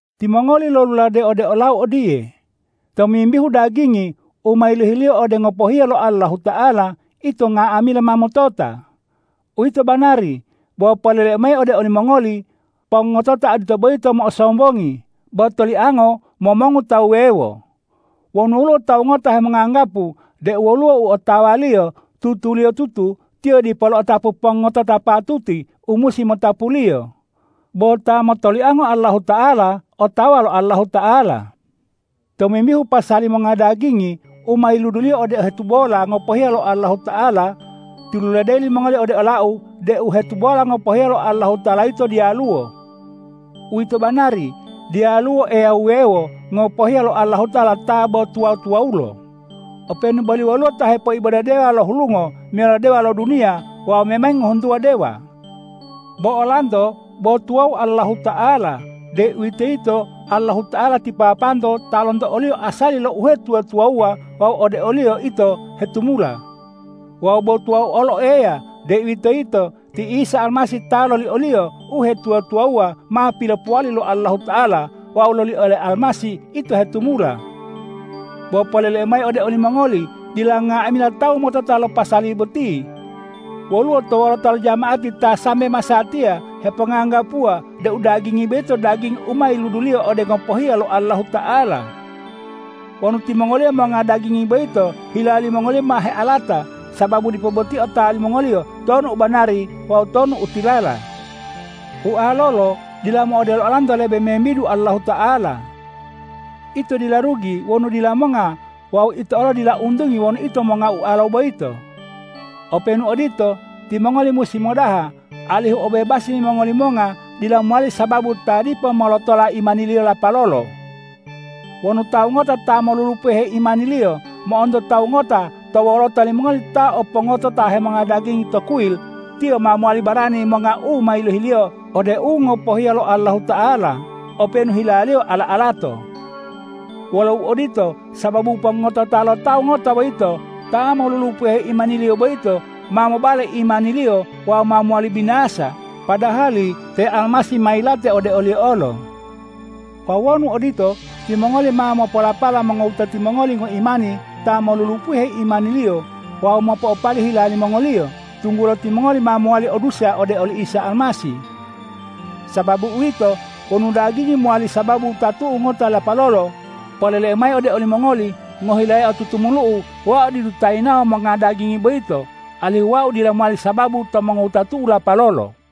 Timongoli loluladeyi ode olau odiye,”Tomimbihu dagingi u ma yilohiliyo ode u ngopohiya lo Allahuta'ala, ito nga'amila ma motota.” Uwito banari, bo poleleu mayi ode olimongoli: Pongotota odito boyito mo'osombongi, bo toliango momongu tawu wuwewo. Wonu woluwo tawu ngota hemonganggapu deu woluwo u otawaliyo, tutuliyotutu tiyo dipo lo'otapu pongotota patuti u musi motapuliyo. Bo ta motoliango Allahuta'ala otawa lo Allahuta'ala. Tomimbihu pasali monga dagingi u ma yiluduliyo ode u hetubola ngopohiya lo Allahuta'ala, tiluladeyi limongoli ode olau deu u hetubola ngopohiya lo Allahuta'ala yito diyaluwo. Uwito banari, diyaluwo Eya wuwewo ngopohiya lo Allahuta'ala ta bo tuwa-tuwawulo, openu boli woluwo ta hepoibode dewa lo hulungo meyalo dewa lo duniya wawu memangi ngohuntuwa dewa. Bo olanto bo tuwawu Allahuta'ala, deuwitoyito Allahuta'ala ti Papanto ta lonto o-Liyo asali lo uhetuwa-tuwawuwa wawu ode o-Liyo ito hetumula; wawu bo tuwawu olo Eya, deuwitoyito ti Isa Almasih ta loli o-Liyo uhetuwa-tuwawuwa ma pilopowali lo Allahuta'ala wawu loli ole Almasih ito hetumula. Bo poleleu mayi ode olimongoli: Dila nga'amila tawu motota lo pasali boti. Woluwo to wolota lo jama'ati ta sambe masatiya heponganggapuwa deu dagingi boyito dagingi u ma yiluduliyo ode u ngopohiya lo Allahuta'ala. Wonu timongoliyo monga dagingi boyito, hila limongoliyo ma healata, sababu dipo boti otawa limongoliyo tonu u banari wawu tonu u tilala. Ualolo dila mo'odelo olanto lebe membidu Allahuta'ala. Ito dila rugi wonu dila monga wawu ito olo dila untungi wonu ito monga ualo boyito. Openu odito, timongoli musi modaha, alihu obebasi limongoli monga dila mowali sababu ta dipo molotola imaniliyo lapalolo. Wonu tawu ngota ta molulupuhe imaniliyo mo'onto tawu ngota to wolota limongoli ta o pongotota hemonga dagingi to kuyil, tiyo ma mowali barani monga u ma yilohiliyo ode u ngopohiya lo Allahuta'ala openu hilaliyo ala-alato. Wolo uodito, sababu pongotota lo tawu ngota boyito, ta molulupuhe imaniliyo boyito ma mobale imaniliyo wawu ma mowali binasa, padahali te Almasih ma yilate ode oliyo olo. Wawu wonu odito, timongoli ma mopolapala mongowutati mongoli ngoimani ta molulupuhe imaniliyo wawu mo'opali hila limongoliyo, tunggulo timongoli ma mowali o dusa ode oli Isa Almasih. Sababu uwito, wonu dagingi mowali sababu wutatu'u ngota lapalolo, poleleu mayi ode olimongoli: Ngohilayao tutumulu'u wau didu ta yinawo monga dagingi boyito, alihu wau dila mowali sababu to mongowutatu'u lapalolo.